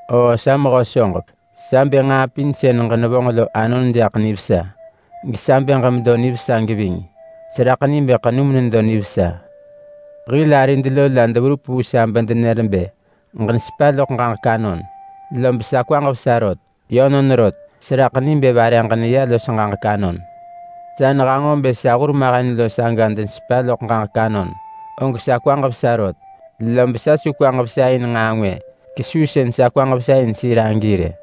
Oo sa mehö soġek! Sa bë nġaa pin sën ġenevonġ lo anon jaḳ nivesa, gesa bë ġemedo nivesa geving. Seraḳ ni bë ḳenum nedo nivesa. Hil arid lo la deverup vu sa bedenër bë ġenesepa loḳ ġaġek anon, lob sa kwaġ vesa rot. Yönon rot, seraḳ ni bë vare ġeneya los ġaġek anon. Sa nehanġo bë sa hurmahen lo saga denesepa loḳ ġaġek anon, og sa kwaġ vesa rot. Lob sa su kwaġ vesa in nġaa ngwë kesuu sën sa kwaġ vesa in sir agi rë.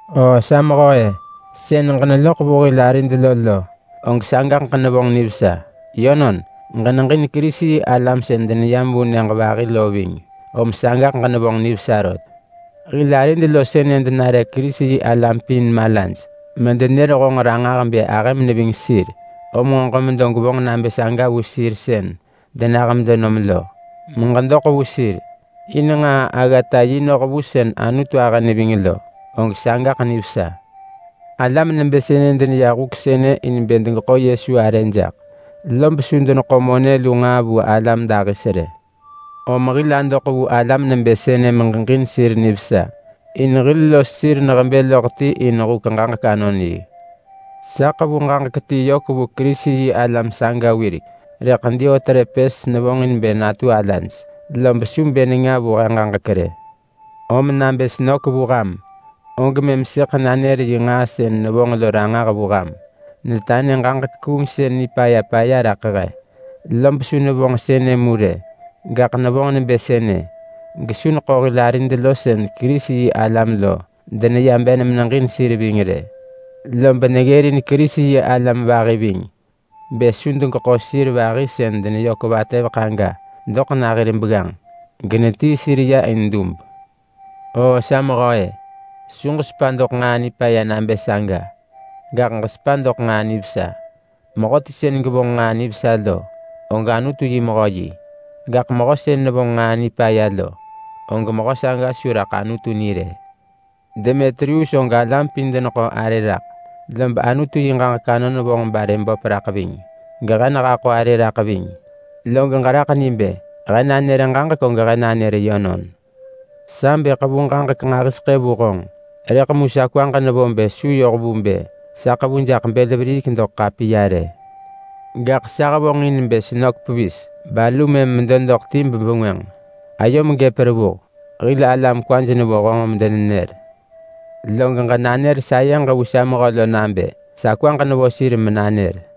Oo sa mehö-e! Sën ġeneloḳ vu hil arid lo lo, og saga ġenevonġ nivesa. Yönon, ġeneġin Kerisi-yi-alam sën deneyam vu nyëġ vahi lo ving, om sagaḳ ġenevonġ nivesa rot. Hil arid lo sënë denare Kerisi-yi-alam pin malaj medenër honġ ranġah bë ahëm neving sir. Om nġo ġemedo gwevonġ nabë saga vu sir sën denah medenom lo, meġedoḳ vu sir in nġaa-aggata-yi noh vu sën Anutu ahë neving lo, og sagaḳ nivesa. Alam nebë sënë deneya huk sënë in bë degeḳo Yesu arë jaḳ, lob su deneḳo monë lu nġaa vu alam dahis rë. Om hil adoḳ vu alam nebë sënë meġeġin sir nivesa, in hil los sir nehebë loḳ ti in huk ġaġek-anon-yi. Sa ḳevu ġaġek ti yök vu Kerisi-yi-alam saga wirek, rëḳ Diotrepes nevonġin bë natu alaj, lob su bë nenga vu he ġaġek rë. Om nabë senök vu ham, og mëm sëḳ nanër yi nġaa sën nevonġ lo ranġah vu ham. Netanë ġaġek kuungsën nipaya paya raḳ he. Lob su nevonġ sënë mu rë, gaḳ nevonġ nebë sënë gesu neḳo hil arid sën Kerisi-yi-alam lo deneya ben meneġin sir ving rë. Lob neggërin Kerisi-yi-alam vahi ving, bë su degeḳo sir vahi sën deneyök vatëveḳ aga doḳ na hir begganġ, genetii sir ya in dub. Oo sa mehö-e! Su ġesepa doḳ nġaa nipaya nabë saga. Gaḳ ġesepa doḳ nġaa nivesa. Mehöti sën gevonġ nġaa nivesa lo, og Anutu yi mehö yi. Gaḳ mehö sën nevonġ nġaa nipaya lo, og mehö saga su raḳ Anutu ni rë. Demetrius og alam pin deneḳo arë raḳ, lob Anutu yi ġaġek anon vonġ barë böp raḳ ving. Gehe nehaḳo arë raḳ ving, log ġeraḳ ni bë he nanër ġaġek og he nanër yönon. Sa bë ḳevu ġaġek nġahiseḳë vu honġ, rëḳ mu sa kwaġ nevo bë su yoh vu bë sa ḳevu jaḳ bël veriik doḳ ḳapiya rë. Gaḳ sa hevonġin bë senök pevis balu mëm medo doḳ ti bebengwënġ. Ayom gëp revuh. Hil alam kwaj nevo honġ medenenër. Log ġenanër sayeġ vu sa mehö lo nabë sa kwaġ nevo sir menanër.